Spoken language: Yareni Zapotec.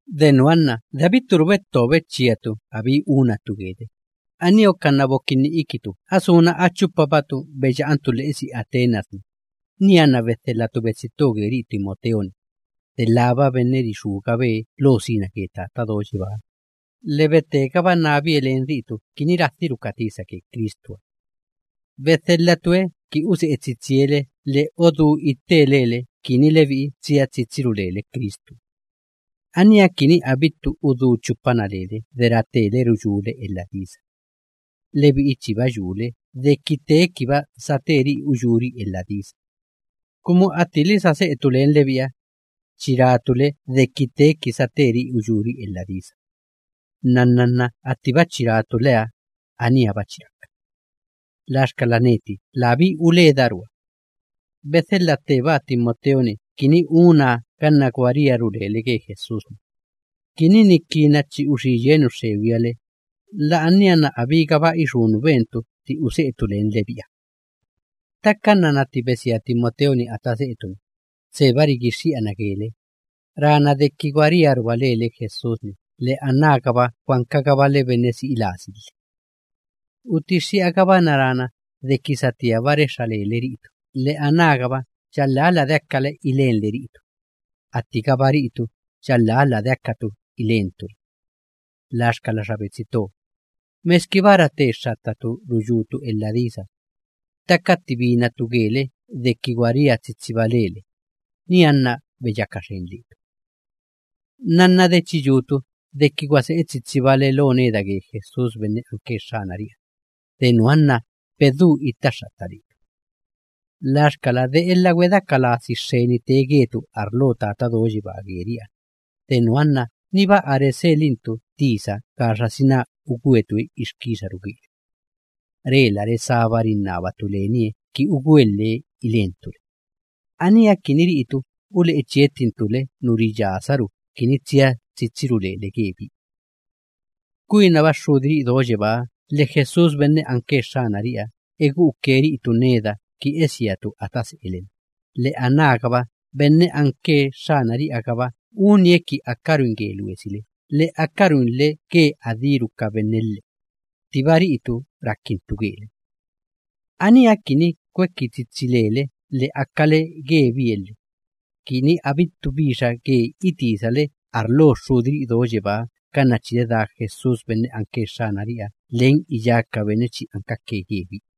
De nuha nna de abitturu betto bechíatu abí unatu gele, aníha uka nna bokinni ikitu a suna a chupabatu beya'antu lhe'esi Atenas‑ni, nianna bedhelhatu betsi to geri'i Timoteo‑ni, delába benne rixúgabe lo sina ge Tata Do Yebáha lhe rutegaba nábie len ri'itu kini radhiru ka tisa ge Cristuha. Bedhelhatue ki use'e tsitsie le lhe odú itte lele kini lebi'i tsia tsitsiru lele ge Cristuha. Aníha kini abittu udú chupana lele de ratele ruyúle elha disa. Lebi'i chiba yule deki tee kiba sateri'i uyúri'i elha disa, kumu attili sa se'etu len lebi'iha, chi ratu le deki teeki sateri'i uyúri'i elha disa. Nnanna nna attiba chi ratu leha, aníha‑ba chi raka. Laxkala neti labí uledarua, bedhelha ttebaa Timoteo‑ni kini unaa ganna gwa riaru lele ge Jesús‑ni, kumu ni kina chi uxí yie nu xxegwiha le, la'ania nna abígaba ixú nu bentu tti use'etu len lebi'iha ganna ttixka. Ttaka nnanna tti besia Timoteo‑ni ata se'etu‑ni, tseba rigixxi'ana gele, rana deki gwa riaruba lele Jesús‑ni lhe anágaba gwa ankagabale benne si'i lasi lhe. Utixxi'agabana rana deki satíaba rexxa lele ri'itu lhe anágaba yalhá ladeakale ilenle ri'itu, attigaba ri'itu yalhá ladeakatu ilentu le. Laxkala xa betsi to, meskiba rate xxattatu ruyútu elha disa, ttaka tti binatu gele deki gwa ria tsitsiba lele, nianna beyaka xen letu. Nnanna de chi yutu deki gwa se'e tsitsibale lo neda ge Jesús benne anke Xxanari'iha, de nuha nna bedú itta xxatta letu. Laxkala, de elha gwedeaka lasi xxeni tee getu arlo Tata Do Yebaa geri'iha, de nuha nna niba a reselintu tisa gaxasina ugwetue ixkixaru gele. Rela resába rinnabatu lenie kini ugwelhe ilentu le, aníha ki ri'itu ule'e chiettintu le nu riyasaru kini tsia tsitsiru lele gebie. Kwinaba Xxudiri'i do yebáha lhe Jesús benne anke Xxanari'iha egu'uke ri'itu neda ki esiatu ata se'ele‑na, lhe anágaba benne anke Xxanari'iha‑gaba unie ki akaruin ge luesile lhe akaruinle ge adíru ka benne lhe, ttiba ri'itu rakintu gele. Aníha kini kweki tsitsi lele lhe akale gebie lhe, kini abittu bixa ge itisale arlo Xxudiri'i do yebáha ganna chi dedá Jesús benne anke Xxanari'iha len iyá ka benne chi ankake gebie.